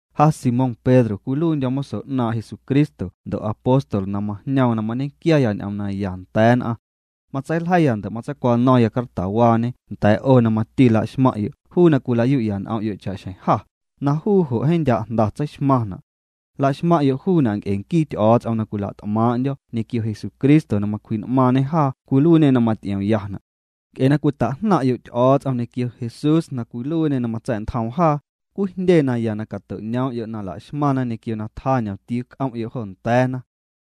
Ja Simón Pedro cwiluiindyo̱ moso 'naaⁿ' Jesucristo ndo' apóstol na majñoom na mañequiaya ñ'oom naya nda̱a̱ nn'aⁿ. Matseiljeiya ndo' matseicwano̱ⁿya cartawaañe nda̱a̱ 'o na mati laxmaⁿ'yo' juu na cwila'yu'ya n'om'yo' cha'xjeⁿ jâ, na juu jo' jeeⁿ ndya' jnda tseixmaⁿna'. Laxmaⁿ'yo' juuna' nc'e nquii Ty'o̱o̱ts'om na cwila't'maaⁿ'ndyo̱ ñequio Jesucristo na macwji'n'maaⁿñê jaa cwiluiiñê na maty'iomyana'. Nc'e na cwita'jnaⁿ'yo' Ty'o̱o̱ts'om ñequio Jesús na cwiluiiñê na matsa̱'ntjoom jaa, cwijndye naya na cato'ñoom'yo' na la'xmaⁿna ñequio na tjaa ñomtiuu c'om'yo' jo nda̱a̱na.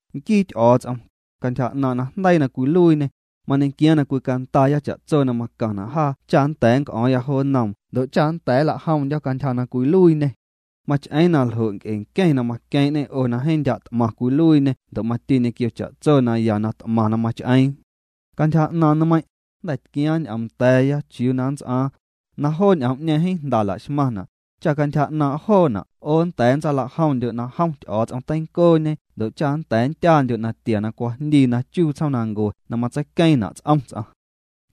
Nquii Ty'o̱o̱ts'om, cantyja 'naaⁿ' najndeii na cwiluiiñê, mañequiaaⁿ na cwicandaaya cha'tso na macaⁿna' jaa cha nnda̱a̱ nnc'o̱o̱ⁿya jo nnoom ndo' cha nnda̱a̱ nlajomndyo̱ cantyja na cwiluiiñê. Mach'eeⁿ na ljo' nc'e nqueⁿ na maqueeⁿ'ñê 'o na jeeⁿ ndya' t'maⁿ cwiluiiñe ndo' mati ñequio cha'tso naya na t'maⁿ na mach'eeⁿ. Cantyja 'naaⁿ nmeiⁿ', jnda̱ tquiaaⁿ ñ'oom nda̱a̱ya chiuu na nnts'aaⁿ, na joo ñ'oom'ñeeⁿ jeeⁿ jnda laxmaⁿna', cha cantyja 'naaⁿ' joona' 'o nnda̱a̱ ntsalajomndyo' na jom Ty'o̱o̱ts'om teincooñe ndo' cha nnda̱a̱ nndyaandyo' natia na cwajndii na chuu tsjoomnancue na matseiqueeⁿna' ts'om ts'aⁿ.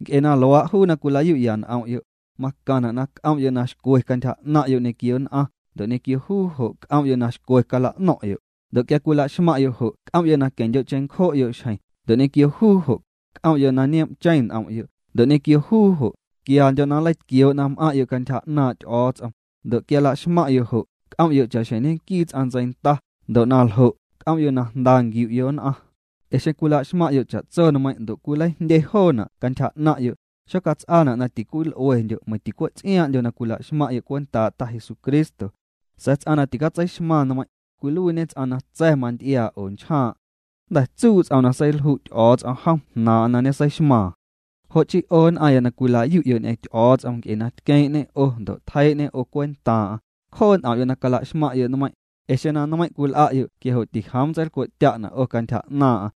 Nc'e na luaa', juu na cwilayu'ya n'om'yo', macaⁿna' na c'om'yo' na xcwe cantyja 'naⁿ'yo' ñequio nn'aⁿ, ndo' ñequio juu jo' c'om'yo' na xcwe cala'no̱ⁿ'yo', ndo' quia cwilaxmaⁿ'yo' jo' c'om'yo' na queⁿndyo' cheⁿncjo'yo' xjeⁿ, ndo' ñequio juu jo', c'om'yo' na nioom'cheⁿ n'om'yo', ndo' ñequio juu jo', quiandyo' na nleitquioo' na m'aⁿ'yo' cantyja 'naaⁿ' Ty'o̱o̱ts'om, ndo' quia laxmaⁿ'yo' jo', c'om'yo' cha'xjeⁿ ñequii ts'aⁿ ntseinda, ndo' na ljo', c'om'yo' na jnda nquiu'yo' nn'aⁿ. Ee xeⁿ cwila'xmaⁿ'yo' cha'tso nmeiⁿ' ndo' cwileijndye joona' cantyja 'naⁿ'yo', xocats'aana' na ticwil'uendyo' meiⁿ ticwe' ts'iaaⁿ'ndyo na cwilaxmaⁿ'yo' cwentaa' Ta Jesucristo. Sa̱a̱ ts'aⁿ na ticatseixmaⁿ nmeiⁿ', cwiluiiñe ts'aⁿ na tsa̱ manty'iaa' oo nchjaaⁿ'. Jnda̱ tsuu' ts'oom na seilju' Ty'o̱o̱ts'om jom jnaaⁿ'aⁿ na ñeseixmaaⁿ. Jo' chii 'o nn'aⁿya na cwila'yu'yo' ñ'eⁿ Ty'o̱o̱ts'om nc'e na tqueeⁿ'ñê 'o ndo' tjeii'ñê 'o cwentaaⁿ'aⁿ, cjoo' n'om'yo' na calaxmaⁿ'yo' nmeiⁿ', ee xeⁿ na nmeiⁿ' cwil'a'yo' quia jo' tijoom nntseilcwe'tya'na' 'o cantyja 'naaⁿ'aⁿ.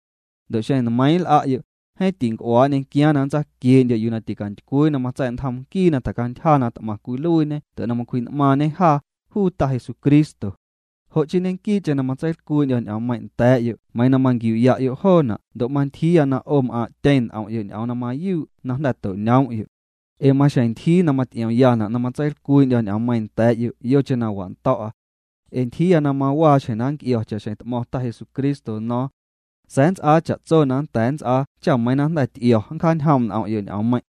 Ndo' xeⁿ nmeiiⁿ' nl'a'yo', jeeⁿ tinc'uaa' nñequiaaⁿ na nntsaquiee'ndyo' yuu na ticantycwii na matsa̱'ntjom nquii na tjacantyja na t'maⁿ cwiluiiñe ndo' na macwji'n'maaⁿñe jaa, juu Ta Jesucristo. Jo' chii ñequii'cheⁿ na matseilcwii'ndyo̱ ñ'oommeiⁿ' nda̱a̱'yo' meiiⁿ na manquiu'ya'yo' joona' ndo' mantyjiiya na 'o m'aaⁿ'tyeⁿ n'om'yo' ñ'oom na mayuu' na jnda̱ to'ñoom'yo'. Ee maxjeⁿ ntyjii na maty'iomyana' na matseilcwii'ndyo̱ ñ'oommeiiⁿ nda̱a̱'yo' yocheⁿ na wa'ndo̱'a. Ee ntyjiiya na mawaxjeⁿ na nnc'io̱, cha'xjeⁿ t'mo̱ⁿ Ta Jesucristo no̱o̱ⁿ. Sa̱a̱ nnts'aa cha'tso na nnda̱a̱ nnts'aa cha meiiⁿ na jnda̱ ty'io̱ nncjaañjoom' n'om'yo' ñ'oommeiⁿ'.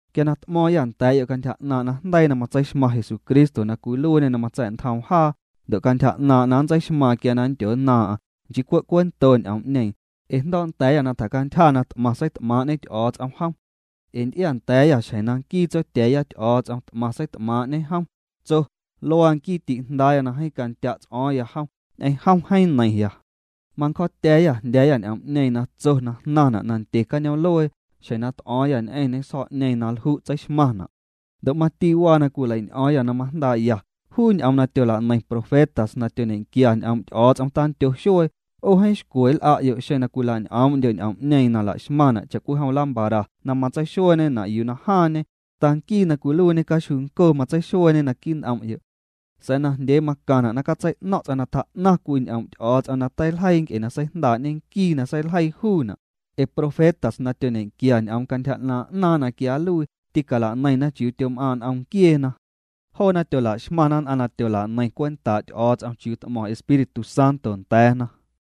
Quia na t'mo̱o̱ⁿyâ nda̱a̱'yo' cantyja 'naaⁿ' najndeii na matseixmaⁿ Jesucristo na cwiluiiñê na matsa̱'ntjoom jaa, ndo' cantyja 'naaⁿ' na nntseixmaaⁿ quia na nndyonnaaⁿ'aⁿ, nchii cwe' cuento ñ'oom'ñeeⁿ, ee jndo̱o̱'nda̱a̱yâ na tjacantyja na t'maⁿ seit'maaⁿ'ñe Ty'o̱o̱ts'om jom. Ee nty'iaanda̱a̱yâ xjeⁿ na nquii Tsotya̱a̱ya Ty'o̱o̱ts'om t'maⁿ seit'maaⁿ'ñe jom, tso: “Luaa nquii ti'Jndaaya na jeeⁿ candya' ts'o̱o̱ⁿya jom, ñ'eⁿ jom jeeⁿ neiⁿya.” Mancjo̱o̱tya̱a̱yâ jndya̱a̱yâ ñ'oom'ñeeⁿ na tso na jnaⁿna' nandye cañoom'luee, xjeⁿ na t'o̱o̱ⁿyâ ñ'eⁿñê sjo̱'ñeeⁿ na lju' tseixmaⁿna'. Ndo' mati waa na cwileiñ'o̱o̱ⁿya na majndaa'ya, juu ñ'oom na tyolaneiⁿ profetas na tyoñequia ñ'oom' Ty'o̱o̱ts'om tandyo xuee, 'o jeeⁿ xcwe nl'a'yo' xeⁿ cwilañ'oom'ndyo' ñ'oom'ñeeⁿ na laxmaⁿna' cha'cwijom lámpara na matseixueeñena' yuu na jaaⁿñe, hasta nquii na cwiluiiñe caxjuuncoo matseixueeñe naquii' n'om'yo'. Sa̱a̱ najndyee macaⁿna' na catsei'no̱ⁿ' ts'aⁿ na tjaa'naⁿ cwii ñ'oom' Ty'o̱o̱ts'om na teiljeii nc'e na seijndaa'ñe nquii na seiljeii juuna', ee profetas na tyoñequia ñ'oom cantyja 'naaⁿ' 'naaⁿ na quia nluii, tîcalaneiⁿna chiuu tyom'aaⁿ' n'om nquieena. Joona tyolaxmaⁿna nn'aⁿ na tyolaneiⁿ cwentaa' Ty'o̱o̱ts'om chiuu t'mo̱ⁿ Espíritu Santo nda̱a̱na.